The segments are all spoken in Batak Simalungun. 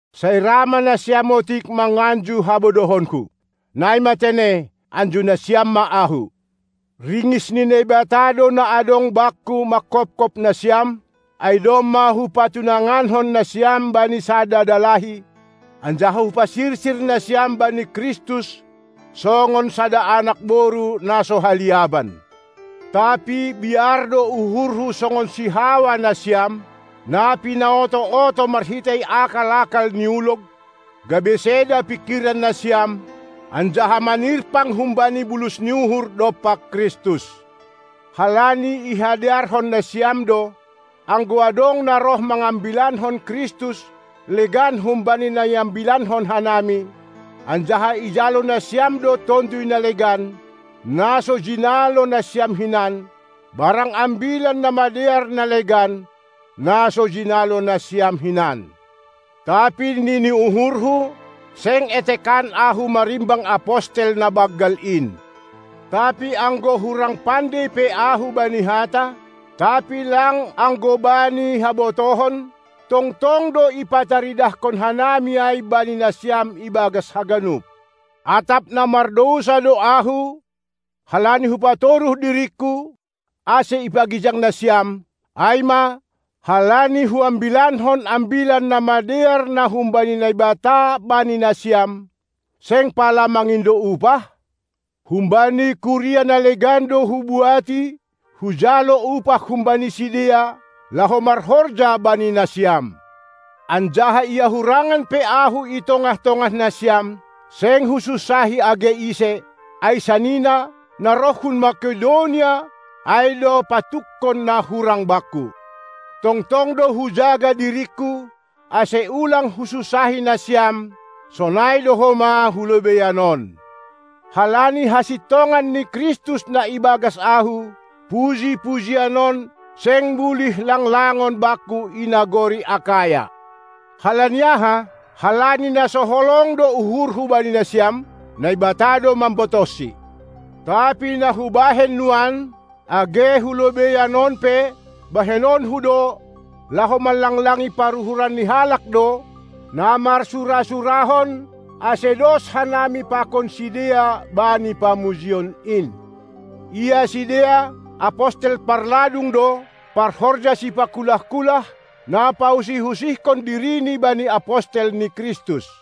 Sai ra ma nasiam otik manganju habodohonku! Nai ma tene, anju nasiam ma ahu! Ringis ni Naibata do na adong bakku manghophop nasiam; ai domma hupatunangankon nasiam bani sada dalahi, anjaha hupasirsir nasiam bani Kristus songon sada anak boru na so haliaban. Tapi biar do uhurhu songon si Hawa nasiam, na pinaoto-oto marhitei akal-akal ni ulog, gabe seda pingkiran nasiam, anjaha manirpang humbani bulus ni uhur dompak Kristus. Halani ihadearhon nasiam do, anggo adong na roh mangambilankon Kristus legan humbani na iambilankon hanami, anjaha ijalo nasiam do tonduy na legan, na so jinalo nasiam hinan, barang ambilan na madear na legan, na so jinalo nasiam hinan. Tapi nini uhurhu, seng etekan ahu marimbang apostel na banggal in. Tapi anggo hurang pandei pe ahu bani hata, tapi lang anggo bani habotohon; tongtong do ipataridahkon hanami ai bani nasiam ibagas haganup. Atap na mardousa do ahu, halani hupatoruh diringku, ase ipagijang nasiam, ai ma, halani huambilankon Ambilan Namadear na humbani Naibata bani nasiam, seng pala mangindo upah? Humbani kuria na legan do hubuati, hujalo upah humbani sidea, laho marhorja bani nasiam. Anjaha ia hurangan pe ahu i tongah-tongah nasiam, seng husunsahi age ise; ai sanina, na roh hun Makedonia, ai do patukkon na hurang bakku. Tongtong do hujaga diringku, ase ulang husunsahi nasiam, sonai do homa hulobeian on. Halani hasintongan ni Kristus na ibagas ahu, puji-pujian on seng bulih langlangon bakku i nagori Akaya. Halani aha? Halani na so holong do uhurhu bani nasiam? Naibata do mambotohsi. Tapi na hubahen nuan, age hulobeian on pe bahenonku do, laho manlanglangi paruhuran ni halak do, na marsura-surahon ase dos hanami pakon sidea bani pamujion in. Ia sidea, apostel parladung do, parhorja sipakulah-kulah, na pausih-usihkon dirini bani apostel ni Kristus.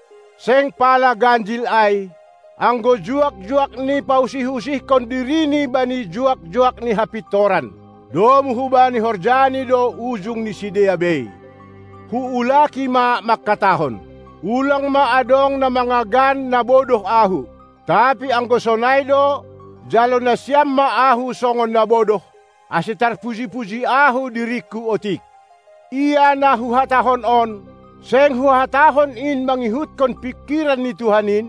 Seng pala ganjil ai, anggo juak-juakni pausih-usihkon dirini bani juak-juak ni hapintoran. Domu hubani horjani do ujung ni sidea bei. Huulaki ma mangkatahon: Ulang ma adong na mangagan na bodoh ahu. Tapi anggo sonai do, jalo nasiam ma ahu songon na bodoh, ase tarpuji-puji ahu diringku otik. Ia na huhatahon on, seng huhatahon in mangihutkon pingkiran ni Tuhan in,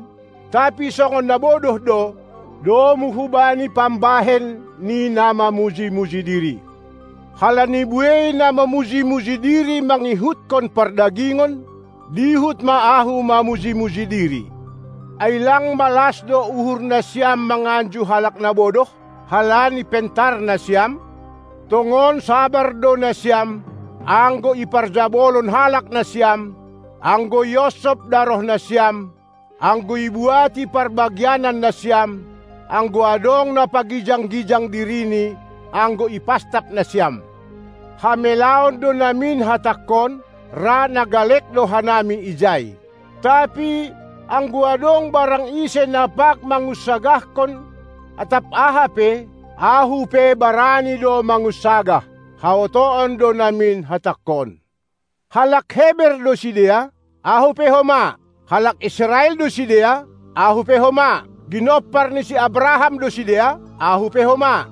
tapi songon na bodoh do, domu hubani pambahen ni na mamuji-muji diri. Halani buei na mamuji-muji diri mangihutkon pardagingon, dihut ma ahu mamuji-muji diri. Ai lang malas do uhur nasiam manganju halak na bodoh, halani pentar nasiam? Tongon sabar do nasiam, anggo iparjabolon halak nasiam, anggo ionsop daroh nasiam, anggo ibuati parbagianan nasiam, anggo adong na pagijang-gijang dirini, anggo ipastap nasiam. Hamelaon do namin hatangkon, ra na galek do hanami ijai. Tapi, anggo adong barang ise na pag mangunsagahkon atap aha pe, ahu pe barani do mangunsagah. Haotoon do namin hatangkon. Halak Heber do sidea? Ahu pe homa. Halak Israel do sidea? Ahu pe homa. Ginompar ni si Abraham do sidea? Ahu pe homa.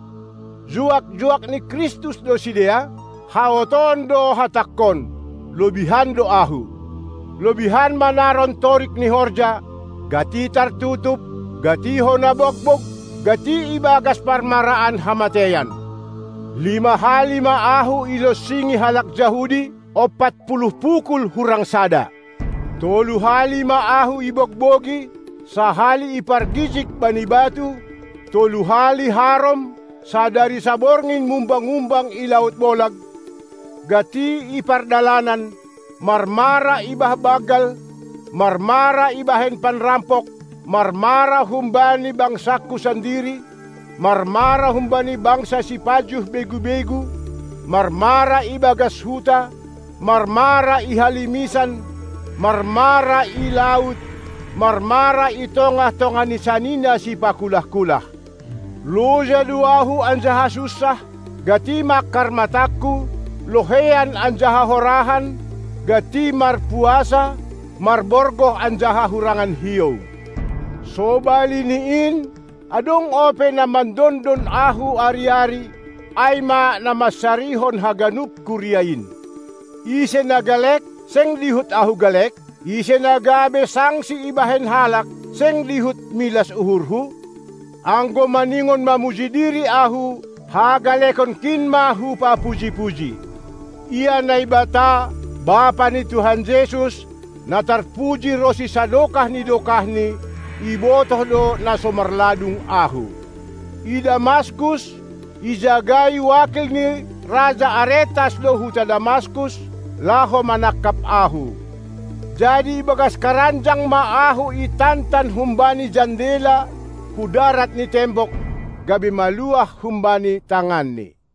Juak-juak ni Kristus do sidea? Haotoon do hatangkon: Lobihan do ahu. Lobihan manaron torik ni horja, gati tartutup, gati hona bogbog, gati ibagas parmaraan hamateian. Lima hali ma ahu ilonsingi halak Jahudi, opat puluh pukul hurang sada. Tolu hali ma ahu ibogbogi, sahali ipargijig bani batu, tolu hali harom, sadari saborngin mumbang-umbang i laut bolag, gati i pardalanan, marmara i bah banggal, marmara ibahen panrampok, marmara humbani bangsangku sandiri, marmara humbani bangsa sipajuh begu-begu, marmara ibagas huta, marmara i halimisan, marmara i laut, marmara i tongah-tongah ni sanina sipakulah-kulah. Loja do ahu anjaha sunsah, gati mangkar matangku, loheian anjaha horahan, gati marpuasa, marborgoh anjaha hurangan hiou. Sobali ni in, adong ope na mandondon ahu ari-ari, ai ma na mansarihon haganup kuria in. Ise na galek, seng dihut ahu galek? Ise na gabe sangsi ibahen halak, seng dihut milas uhurhu? Anggo maningon mamuji diri ahu, hagalekonkin ma hupapuji-puji. Ia Naibata, Bapa ni Tuhan Jesus, na tarpuji ronsi sadokah ni dokahni, ibotoh do na so marladung ahu. I Damaskus, ijagai wakil ni raja Aretas do huta Damaskus, laho manangkap ahu. Jadi ibagas karanjang ma ahu itantan humbani jandela hudarat ni tembok, gabe maluah humbani tanganni.